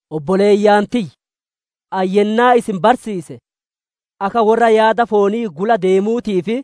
Obboleeyyan tiyya, ani yennaa isin barsiise akka worra yaada foonii gula deemuutii fi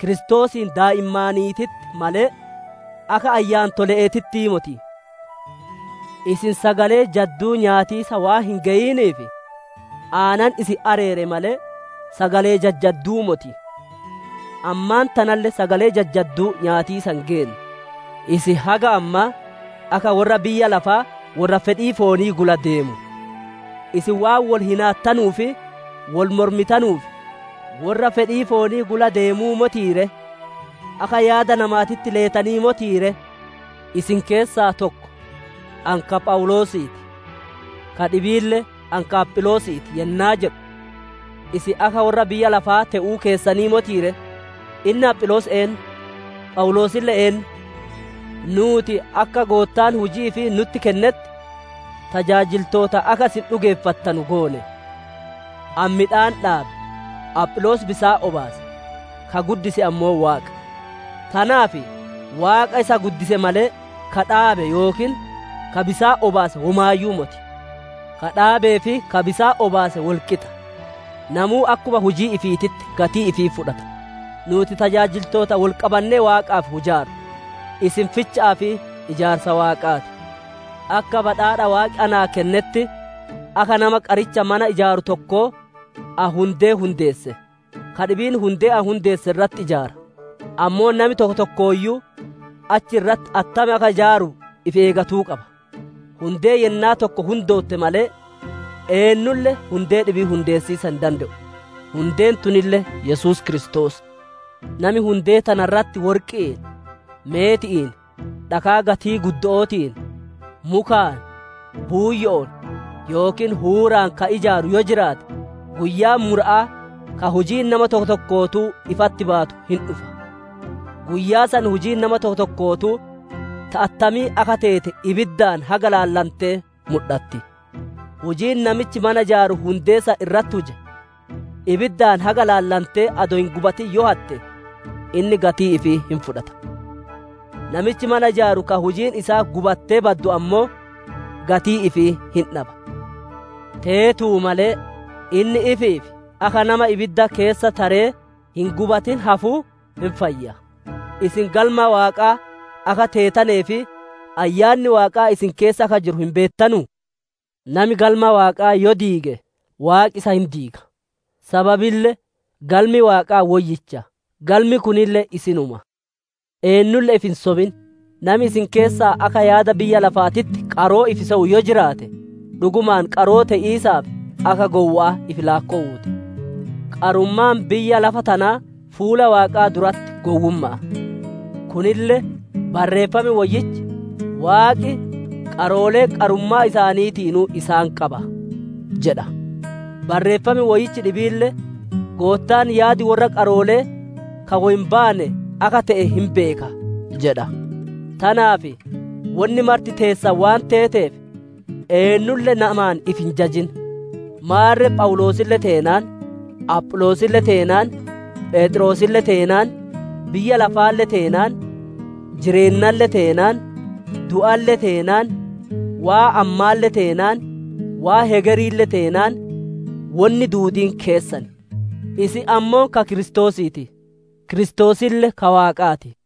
Kiristoosiin daa'immaaniititti malee, akka ayyaantole'eetittii moti. Isin sagalee jadduu nyaatiisa waan hin geyiniif, aanan isin areere malee sagalee jajjadduu moti. Ammaan tanalle sagalee jajjadduu nyaatiisa hin geenne. Isin haga ammaa akka worra biyya lafaa worra fedhii foonii gula deemu; isin waan wol hinaattanuu fi wol mormitanuuf, worra fedhii foonii gula deemuu motii ree? Akka yaada namaatitti leetanii motii ree? Isin keessaa tokko, «Ani ka Phawuloosii ti;» ka dhibiille, «Ani ka Apholoosii ti» yennaa jedhu, isin akka worra biyya lafaa te'uu keessanii motii ree? Inni Apholoos eennu? Phawuloosille eennu? Nuuti akka Goottaan hujii ifii nutti kennetti, tajaajiltoota akka isin dhugeeffattanu goone. Ani midhaan dhaabe, Apholoos bisaan obaase, ka guddise ammoo Waaqa. Tanaaf Waaqa isa guddise malee, ka dhaabe yookiin ka bisaan obaase womaayyuu moti. Ka dhaabee fi ka bisaan obaase wol qixa. Namuu akkuma hujii ifiititti gatii ifii fudhata. Nuuti tajaajiltoota wolqabannee Waaqaaf hujaarru; isin ficha'aa fi ijaarsa Waaqaa ti. Akka badhaadha Waaqi naa kennetti akka nama qaricha mana ijaaru tokkoo ani hundee hundeesse; ka dhibiin hundee ani hundeesse irratti ijaara. Ammoo nami tokko tokkooyyuu achi irratti attam akka ijaaru ifi eegatu qaba. Hundee yennaa tokko hundootte malee, eennulle hundee dhibii hundeessiisa hin dande'u. Hundeen tunille Yesuus Kiristoos. Nami hundee tana irratti worqi'iin, meeti'iin, dhakaa gatii guddo'ootiin, mukaan, buuyyo'oon yookiin huuraan ka ijaaru yoo jiraate, guyyaan mura'aa ka hujiin nama tokko tokkootuu ifatti baatu hin dhufa; guyyaa san hujiin nama tokko tokkootuu ta attamii akka teete ibiddaan haga ilaalantee mudhatti. Hujiin namichi mana ijaaru hundee san irratti huje, ibiddaan haga ilaallatantee adoo hin gubatin yoo hatte inni gatii ifii hin fudhata. Namichi mana ijaaru ka hujiin isaa gubattee baddu ammoo gatii ifii hin dhaba; teetuu malee inni ifiif akka nama ibidda keessa taree hin gubatin hafuu hin fayya. Isin galma Waaqaa akka teetanee fi Ayyaanni Waaqaa isin keessa akka jiru hin beettanuu? Nami galma Waaqaa yoo diige, Waaqi isa hin diiga. Sababille galmi Waaqaa woyyicha, galmi kunille isinuma. Eennulle ifi hin sobin. Nami isin keessaa akka yaada biyya lafaatitti qaroo ifi sewu yoo jiraate, dhugumaan qaroo te'iisaaf akka gowwa'aa ifi laakkowuu ti. Qarummaan biyya lafa tanaa fuula Waaqaa duratti gowwumma'a. Kunille Barreeffam Woyyichi, «Waaqi qaroolee qarummaa isaaniitiinuu isaan qaba» jedha; Barreeffam Woyyichi dhibiille, «Goottaan yaadi worra qaroolee ka woy hin baane akka te'e hin beeka» jedha. Tanaaf wonni marti teessan waan teeteef eennulle namaan ifi hin jajin. Maarre Phawuloosille teenaan, Apholoosille teenaan, Pheexroosille teenaan, biyya lafaalle teenaan, jireennalle teenaan, du'alle teenaan, waan ammaalle teenaan, waan hegeriille teenaan wonni duudiin keessan. Isin ammoo ka Kiristoosii ti; Kiristoosille ka Waaqaa ti.